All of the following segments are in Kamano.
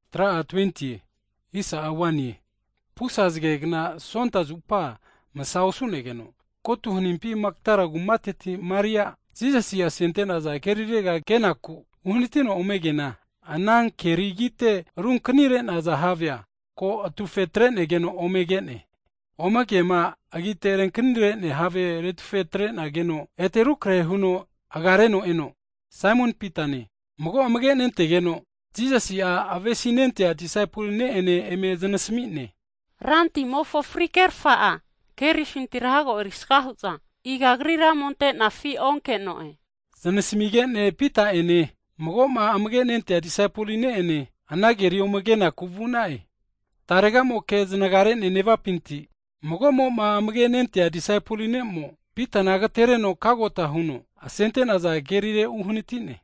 Hagi pusa zagegna Sonta zupa masa osu'negeno, ko'atu hanimpi Magdala kumateti Maria'a, Jisasima asente'naza kerirega kenaku uhanatino ome keana, ana keri agite runkanire'naza havea ko atufe atre'nageno ome ke'ne. Ome keama agite runkanire have retufe atre'nageno, ete rukrahe huno agareno eno Saimon Pitane, mago amage nentegeno Jisasi'ma avesi'nentea disaipoli ne'ene eme znasmi'ne. Ramofo fri'kerfa'a kerifintira hago erisaga hu'za iga Agrira ome ante'nafi onke'none. Zanasamige'ne Pita'ene mago'ma amage' ante'nea disaipoli ne'ene ana keriga ome kenaku vu'na'e. Tarega'moke znaga re'ne nevapinti, mago'ma amage' ante'nea disaipol ne'mo, Pitana agtereno kagota huno asente'naza havegantera uhanati'ne.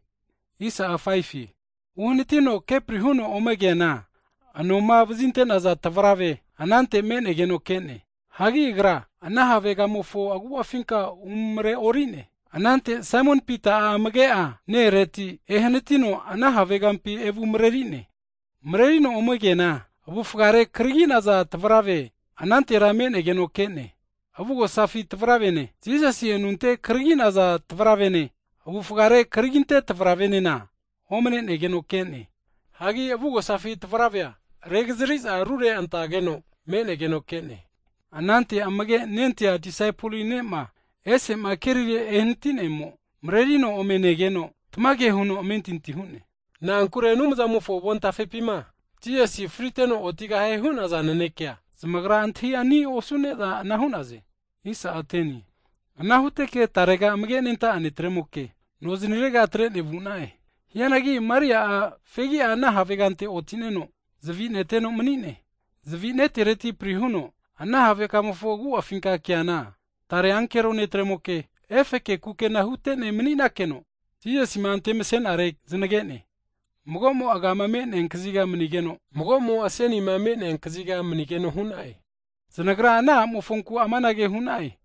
Uhanatino upri huno ome keana anoma vazinte'naza tavrave (linen) anante me'negeno ke'ne, hagi agra ana havegamofo agu'afinka umare ori'ne. Anante Saimon Pita'a amage'a ne-ereti ehanatino ana havegampi evumareri'ne, marerino ome keana avufare karagi'naza tavrave anantera me'negeno ke'ne. Hagi avugosafi tavravene Jisasi anunte karaginte'naza tavravema, avufare karaginte'naza tavravenena, omne'negeno ke'ne. Hianagi avugosafi tavravea regazri'za rure antageno me'negeno ke'ne. Anante amage nentea disaipoli ne'ma ese'ma kerire ehanati'nemo, mrerino ome negeno tamage huno amentinti hu'ne. Na'ankure Anumzamofo avontafepima Jisasi'a friteno otigahie hu'naza nanekea, zamagra antahi ani osune'za ana hu'naze. Ana huteke tarega amage' nenta'a disaipol ne'tremoke, noznirega atre'ne vu'na'e. Hianagi Maria'a fegi'a ana havegante oti'neno zavi neteno mani'ne. Zavi netereti pri huno ana have kamofo agu'afinka keana, tare ankero netremoke efe kukena hute'ne mani'nakeno, Jisasima antemse'nare zanage'ne. Mago'mo'a agama me'nea kaziga manigeno, mago'mo'a asenima me'nea kaziga manigeno hu'na'e. Zanagra ana a'mofonku amanage hu'na'e,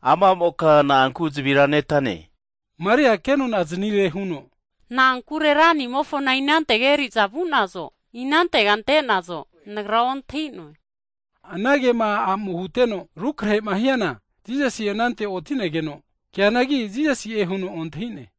Ama a'moka na'anku zavira netane? Maria'a ke nonaznire huno, na'ankure Ranimofona inantega eri'za vu'nazo, inantega ante'nazo nagra ontahi'noe. Anagema ana a'mo'ma huteno'ma rukrahe'ma hiana, Jisasi'a anante oti'negeno keanagi, Jisasi'e huno ontahi'ne.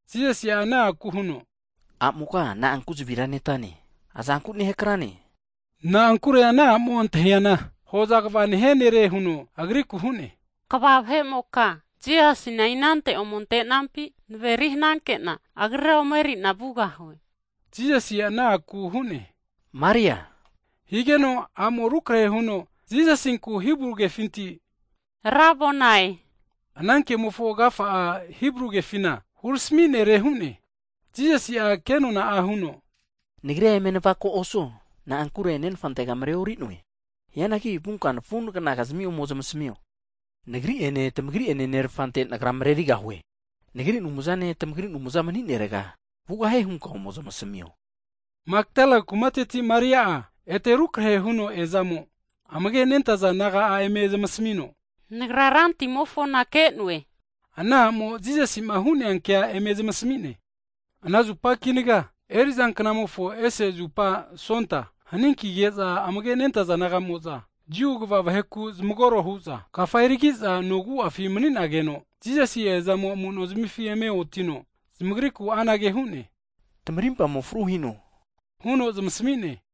Jisasi'a ana a'ku huno, A'moka na'anku zavira netane? Azanku nehakrane? Na'ankure ana a'mo antahiana hoza kva nehia nere nehuno Agrikura anage hu'ne, Kva vahe'moka, Jisasina inante ome ante'nampi naveri hananke'na Agrira ome eri'na vugahue. Jisasi'a ana a'kura huno, Maria! Higeno a'mo'a rukrehe huno Jisasinku Hibru kefinti, Rabonai! (ana kemofo agafa'a Hibru kefina Rempi hurami nere hu'ne.) Jisasi'a ke nona'a huno, Nagrira eme navako osuo, na'ankure Nenfantega mareori'noe. Hianagi vunka nafuhe'ina ome zamasmio, Nagri'ene tamagri'ene Nerfante, Nagra marerigahue. Nagri Anumzane, tamagri Anumza mani'nerega vugahie hunka ome zamasmio. Higeno Magdala kumateti Maria'a ete rukrahe huno eazamo, amage'ma nentaza disaipol naga'a eme zamasmino, nagra Rantimofona ke'noe! Nehuno ana a'mo'a Jisasi'ma hu'nea ke eme zamasmi'ne. Sontamofo amefi ese knamofo kinaga, haninkige'za amage nentaza disaipol naga'mo'za Jiu kva vaheku zamagoro hu'za kafa eri ki'za no agu'afi mani'nageno, Jisasi'a eazamo amu'nozmifi eme otino zamagrikura anage hu'ne, Tamarimpamo fru hino, huno zamasmi'ne.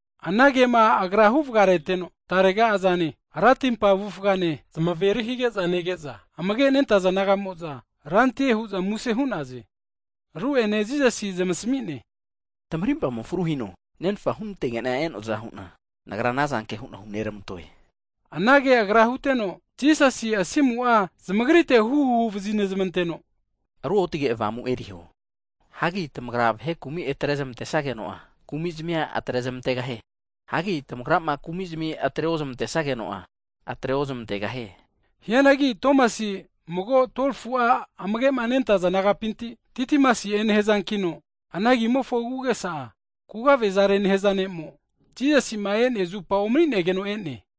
Anagema Agra huvagareteno, tarega azane, ratimpa avufane zamaveri higeza nege'za amage' nentaza disaipol naga'mo'za, Rantie hu'za muse hu'naze. Ru'ene Jisasi'a amanage huno zamasmi'ne, Tamarimpamo fru hino, Nenfa hunantege'na e'noaza hu'na, Nagra anazanke hu'na huneramantoe. Anage Agra huteno, Jisasi'a asimu'a zamagritega huhu hunetreno Ruotge Avamu eriho. Hagi tamagra vahe'mokizmi kumi atrezamantesageno'a, kumi'zmia atre zamantegahie. Hagi tamagrama kumi'zmi atre ozmantesageno'a, atre ozmantegahie. Hianag Tomasi'a, 12fu'a amagema nentaza disaipol nagapinti mago zmimokino agi'a Didimasi'e nehaza nere. Ana agi'amofo agu'agesa'a kugavezare nehaza ne'kino, Jisasi'ma e'nea zupa omani'negeno e'ne.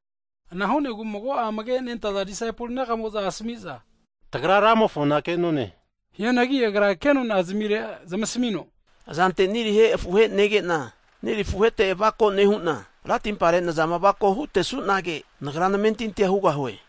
Ana hu'negu mago'a amage nentaza disaipol naga'mo'za asami'za, Tagra Ramofona ke'none! Hianagi agra ke nona zamire zamasmino, Azante niri afuhe nege'na niri afuhete avako nehu'na, ratimpare nazama avako hutesu'nage, nagra namentintia hugahue.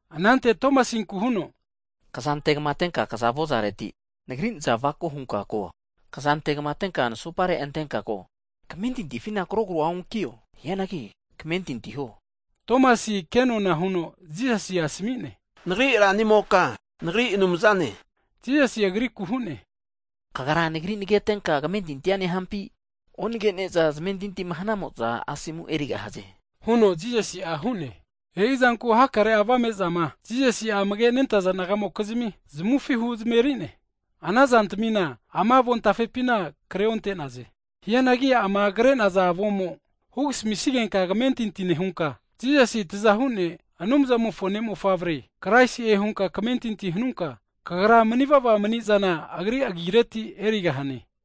Anante Tomasinku huno, Kza antegma atenka kaza avozareti, Nagri nazana avako hunka ko. Kza antegma atenka nasopare antenka ko. Kmentintifina krogro onkio, hianagi kamentinti huo. Tomasi'a ke nona huno Jisasina asmi'ne, Nagri Ranimoka, nagri Anumzane! Jisasi'a agrikura anage hu'ne, Kagra Nagri nagetenka kamentintia nehampi? Onage'neza zamentinti hanamo'za, Asomura erigahaze, huno Jisasi'a hu'ne. E'izanku hakare'a kaguvazama Jisasi'a amage nentaza disaipol naga'mokizmi zamufi huzmeri'ne. Ana zantamina ama avontafepina kre onte'noe. Hianagi ama kre'noa avomo hugasamisigenka kamentinti nehunka, Jisasi'a Tazahu ne', Anumzamofo Ne'mofavre, Kraisi'e hunka kamentinti hanunka kagra manivava mani'zana Agri agireti erigahane.